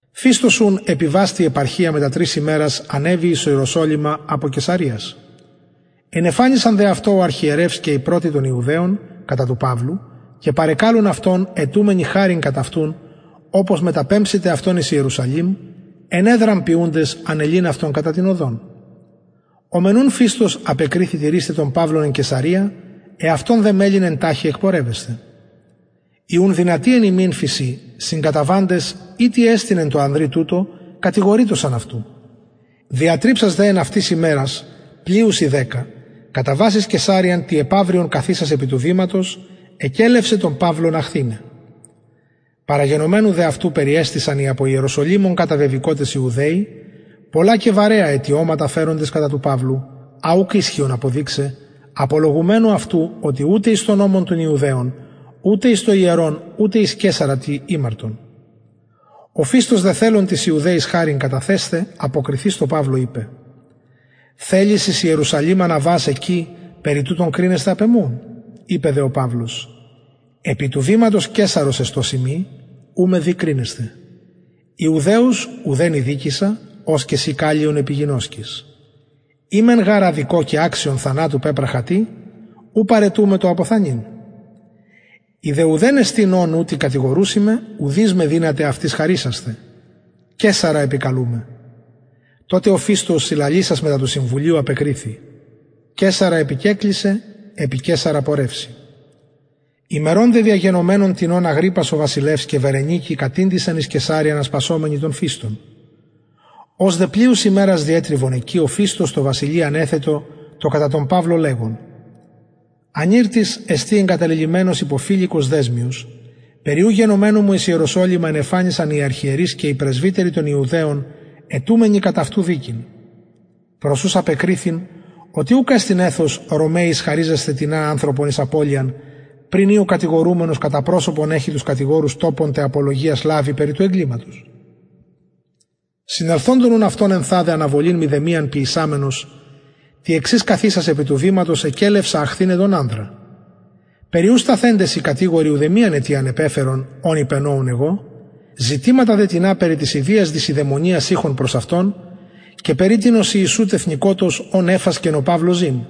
φηστος ουν επιβας τη επαρχια μετα τρεις ημερας ανεβη εις ιεροσολυμα απο καισαρειας ενεφανισαν δε αυτω ο αρχιερευς και οι πρωτοι των ιουδαιων κατα του παυλου και παρεκαλουν αυτον αιτουμενοι χαριν κατ αυτου οπως μεταπεμψηται αυτον εις ιερουσαλημ ενεδραν ποιουντες ανελειν αυτον κατα την οδον ο μεν ουν φηστος απεκριθη τηρεισθαι τον παυλον εν καισαρεια εαυτον δε μελλειν εν ταχει εκπορευεσθαι οι ουν δυνατοι εν υμιν φησιν συγκαταβαντες ει τι εστιν εν τω ανδρι τουτω κατηγορειτωσαν αυτου διατριψας δε εν αυτοις ημερας πλειους η δεκα καταβας εις καισαρειαν τη επαυριον καθισας επι του βηματος εκελευσεν τον παυλον αχθηναι παραγενομενου δε αυτου περιεστησαν οι απο ιεροσολυμων καταβεβηκοτες ιουδαιοι πολλα και βαρεα αιτιωματα φεροντες κατα του παυλου α ουκ ισχυον αποδειξαι απολογουμενου αυτου οτι ουτε εις τον νομον των ιουδαιων ουτε εις το ιερον ουτε εις καισαρα τι ημαρτον ο φηστος δε τοις ιουδαιοις θελων χαριν καταθεσθαι αποκριθεις τω παυλω ειπεν θελεις εις ιεροσολυμα αναβας εκει περι τουτων κρινεσθαι επ εμου ειπεν δε ο παυλος επι του βηματος καισαρος εστως ειμι ου με δει κρινεσθαι ιουδαιους ουδεν ηδικησα ως και συ καλλιον επιγινωσκεις ει μεν γαρ αδικω και αξιον θανατου πεπραχα τι ου παραιτουμαι το αποθανειν ει δε ουδεν εστιν ων ουτοι κατηγορουσιν μου ουδεις με δυναται αυτοις χαρισασθαι καισαρα επικαλουμαι τοτε ο φηστος συλλαλησας μετα του συμβουλιου απεκριθη καισαρα επικεκλησαι επι καισαρα πορευση ημερων δε διαγενομενων τινων αγριππας ο βασιλευς και βερνικη κατηντησαν εις καισαρειαν ασπασαμενοι τον φηστον ως δε πλειους ημερας διετριβεν εκει ο φηστος τω βασιλει ανεθετο τα κατα τον παυλον λεγων ανηρ τις εστιν καταλελειμμενος υπο φηλικος δεσμιος περι ου γενομενου μου εις ιεροσολυμα ενεφανισαν οι αρχιερεις και οι πρεσβυτεροι των ιουδαιων αιτουμενοι κατ αυτου δικην προς ους απεκριθην οτι ουκ εστιν εθος ρωμαιοις χαριζεσθαι τινα ανθρωπον εις απωλειαν πριν η ο κατηγορουμενος κατα προσωπον εχοι τους κατηγορους τοπον τε απολογιας λαβοι περι του εγκληματος συνελθοντων ουν αυτων ενθαδε αναβολην μηδεμιαν ποιησαμενος τη εξης καθισας επι του βηματος εκελευσα αχθηναι τον ανδρα περι ου σταθεντες οι κατηγοροι ουδεμιαν αιτιαν επεφερον ων υπενοουν εγω ζητηματα δε τινα περι της ιδιας δεισιδαιμονιας ειχον προς αυτον και περι τινος ιησου τεθνηκοτος ον εφασκεν ο παυλος ζην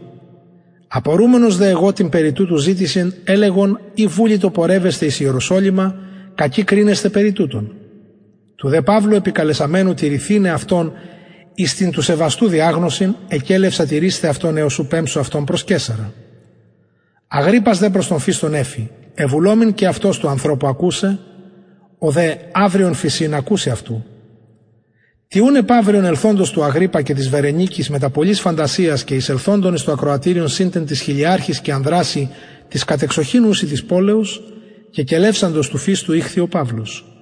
απορουμενος δε εγω την περι τουτου ζητησιν ελεγον ει βουλοιτο πορευεσθαι εις ιερουσαλημ κακει κρινεσθαι περι τουτων του δε παυλου επικαλεσαμενου τηρηθηναι αυτον εις την του σεβαστου διαγνωσιν εκελευσα τηρεισθαι αυτον εως ου πεμψω αυτον προς καισαρα αγριππας δε προς τον φηστον εφη εβουλομην και αυτος του ανθρωπου ακουσαι ο δε αυριον φησιν ακουση αυτου τη ουν επαυριον ελθοντος του αγριππα και της βερνικης μετα πολλης φαντασιας και εισελθοντων εις το ακροατηριον συν τε τοις χιλιαρχοις και ανδρασιν τοις κατ εξοχην ουσιν της πολεως και κελευσαντος του φηστου ηχθη ο παυλος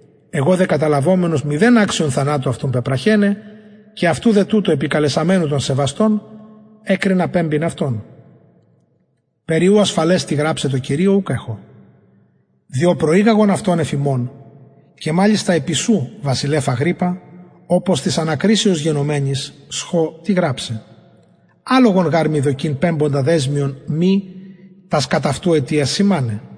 εγω δε καταλαβομενος μηδεν αξιον θανατου αυτον πεπραχεναι και αυτου δε τουτου επικαλεσαμενου τον σεβαστον εκρινα πεμπειν αυτον περι ου ασφαλες τι γραψαι τω κυριω ουκ εχω διο προηγαγον αυτον εφ υμων και μαλιστα επι σου βασιλευ αγριππα οπως της ανακρισεως γενομενης σχω τι γραψαι αλογον γαρ μοι δοκει πεμποντα δεσμιον μη και τας κατ αυτου αιτιας σημαναι